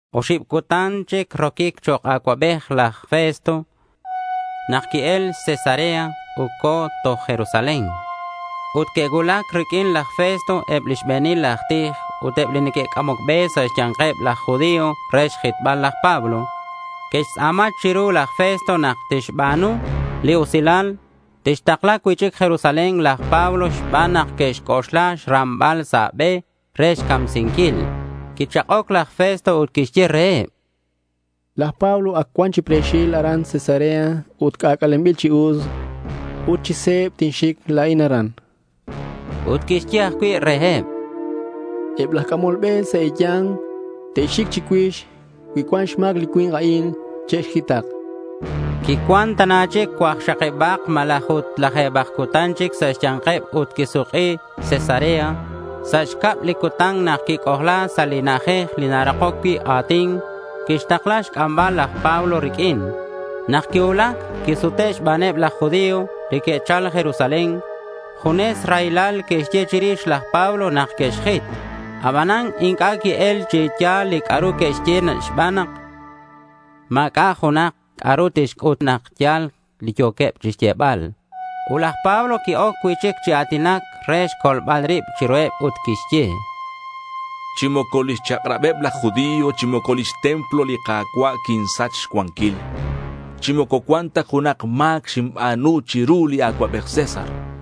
Oxib cutan chic roquic chok' acuabej laj Festo, nak qui-el Cesarea ut co̱ toj Jerusalén. Ut que'cuulac riq'uin laj Festo eb li xbe̱nil aj tij ut eb li neque'c'amoc be sa' xya̱nkeb laj judío re xjitbal laj Pablo. Que'xtz'a̱ma chiru laj Festo nak tixba̱nu li usilal, tixtakla cui'chic Jerusalén laj Pablo xban nak que'xc'oxla xrambal sa' be re xcamsinquil. Quichak'oc laj Festo ut quixye reheb: —Laj Pablo ac cuan chi pre̱xil aran Cesarea ut c'ac'alenbil chi us. Ut chi se̱b tinxic la̱in aran, chan. Ut quixye ajcui' reheb: —Eb laj c'amol be sa' e̱ya̱nk te'xic chicuix. Cui cuan xma̱c li cui̱nk a'in, che'xjitak, chan reheb. Quicuan tana chic cuakxakibak malaj ut laje̱bak cutan chic sa' xya̱nkeb ut quisuk'i Cesarea. Sa' xcab li cutan nak quic'ojla sa' li na'ajej li narakoc cui' a̱tin, quixtakla xc'ambal laj Pablo riq'uin. Nak quicuulac, quisute' xbaneb laj judío li que'chal Jerusalén. Junes raylal que'xye chirix laj Pablo nak que'xjit. Abanan inc'a' qui-el chi ya̱l li c'a'ru que'xye xban nak ma̱c'a' junak c'a'ru tixc'ut nak ya̱l li yo̱queb chixyebal. Ut laj Pablo qui-oc cui'chic chi a̱tinac re xcolbal rib chiruheb ut quixye: —Chi moco lix chak'rabeb laj judío chi moco lix templo li Ka̱cua' quinsach xcuanquil. Chi moco cuan ta junak ma̱c xinba̱nu chiru li acuabej César, chan.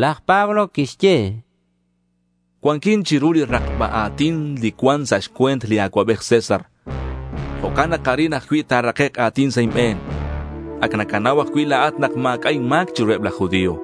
Laj Pablo quixye: —Cuanquin chiru li rakba a̱tin li cuan sa' xcue̱nt li acuabej César. Jo'can nak arin ajcui' ta̱rakek' a̱tin sa' inbe̱n. Ac nacanau ajcui' la̱at nak ma̱c'a' inma̱c chiruheb laj judío.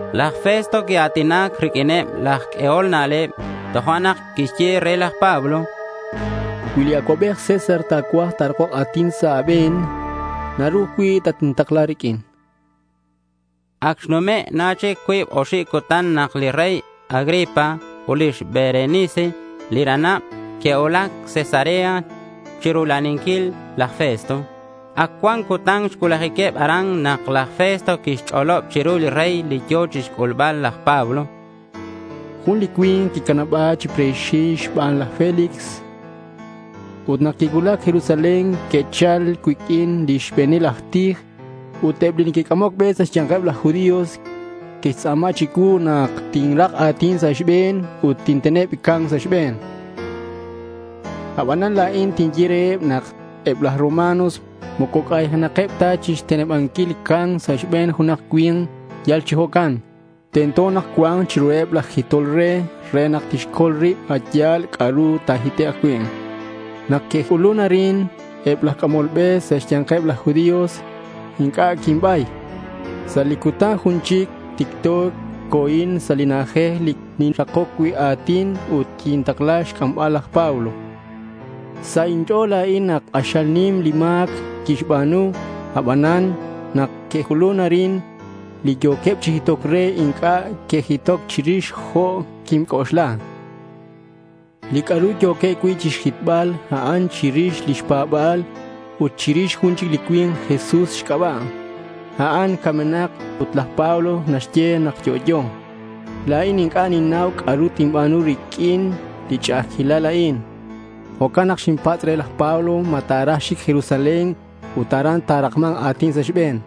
Ut laj Festo quia̱tinac riq'uineb laj q'uehol na'leb. Tojo'nak quixye re laj Pablo: —Cui li acuabej César ta̱cuaj ta̱rakok a̱tin sa' a̱be̱n, naru ajcui' tatintakla riq'uin, chan. Ac xnume' na chic cuib oxib cutan nak li rey Agripa ut lix Berenice li ranab que'cuulac Cesarea chirula'aninquil laj Festo. Ac cuan cutan xcuulajiqueb aran, nak laj Festo quixch'olob chiru li rey li yo̱ chixc'ulbal laj Pablo: —Jun li cui̱nk quicanaba̱c chi pre̱xil xban laj Félix, chan re. Ut nak quincuulac Jerusalén que'chal cuiq'uin lix be̱nil aj tij ut eb li neque'c'amoc be sa' xya̱nkeb laj judío. Que'xtz'a̱ma chicuu nak tinrak a̱tin sa' xbe̱n ut tinteneb ca̱mc sa' xbe̱n. Abanan la̱in quinye reheb nak eb laj Roma moco c'aynakeb ta chixtenebanquil ca̱mc sa' xbe̱n junak cui̱nk yal chi jo'can. Tento nak cua̱nk chiruheb laj jitol re, re nak tixcol rib a' yal c'a'ru ta̱jitek' cui'. Nak que'c'ulun arin eb laj c'amol be sa' xya̱nkeb laj judío, inc'a' quinbay. Sa' li cutan jun chic ticto co̱in sa' li na'ajej li ninrakoc cui' a̱tin. Ut quintakla xc'ambal laj Pablo. Sa' inch'o̱l la̱in nak k'axal nim li ma̱c quixba̱nu. Abanan nak que'c'ulun arin li yo̱queb chi jitoc re, inc'a' que'jitoc chirix jo' quinc'oxla. Li c'a'ru yo̱queb cui' chixjitbal, a'an chirix lix pa̱ba̱leb, ut chirix jun li cui̱nk Jesús xc'aba', ac camenak ut laj Pablo naxye nak yo'yo. La̱in inc'a' xinnau c'a'ru tinba̱nu riq'uin li ch'a'ajquilal a'in. Jo'can nak xinpatz' re laj Pablo ma ta̱raj xic Jerusalén ut aran ta̱rakma̱nk a̱tin sa' xbe̱n.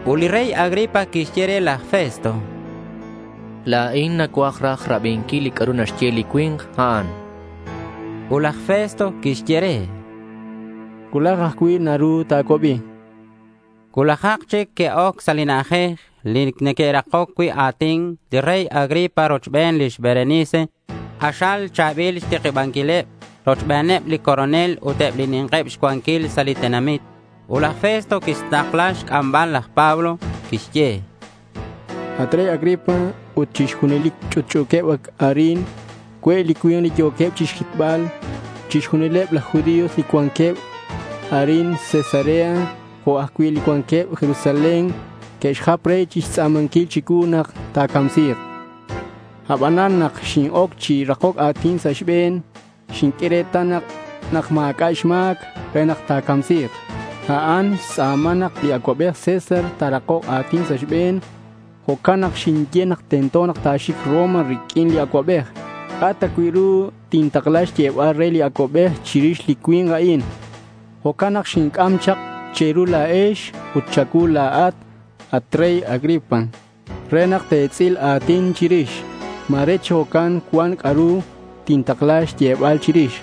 Ut li rey Agripa quixye re laj Festo: —La̱in nacuaj raj rabinquil li c'a'ru naxye li cui̱nk a'an, chan. Ut laj Festo quixye re: —Cuulaj ajcui' naru ta̱cuabi, chan. Cuulajak chic que'oc sa' li na'ajej li neque'rakoc cui' a̱tin li rey Agripa rochben lix Berenice. K'axal cha̱bil xtikibanquileb. Rochbeneb li coronel ut eb li ni̱nkeb xcuanquil sa' li tenamit. Ut laj Festo quixtakla xc'ambal laj Pablo. Quixye: —At rey Agripa ut chixjunilex li ch'utch'u̱quex arin, cue' li cui̱nk li yo̱queb chixjitbal chixjunileb laj judío li cuanqueb arin Cesarea jo'queb ajcui' li cuanqueb Jerusalén. Neque'xjap re chixtz'a̱manquil chicuu nak ta̱camsi̱k. Abanan nak xin-oc chi rakoc a̱tin sa' xbe̱n xinq'ue retal nak ma̱c'a' xma̱c re ta̱camsi̱k. A'an xtz'a̱ma nak li acuabej César ta̱rakok a̱tin sa' xbe̱n. Jo'can nak xinye nak tento ta̱xic Roma riq'uin li acuabej. ¿C'a' ta cui' ru tintakla xyebal re li acuabej chirix li cui̱nk a'in? Jo'can nak xinc'am chak che̱ru la̱ex ut cha̱cuu la̱at, at rey Agripa, re nak te̱tz'il a̱tin chirix. Ma̱re chi jo'can cuan c'a'ru tintakla xyebal chirix.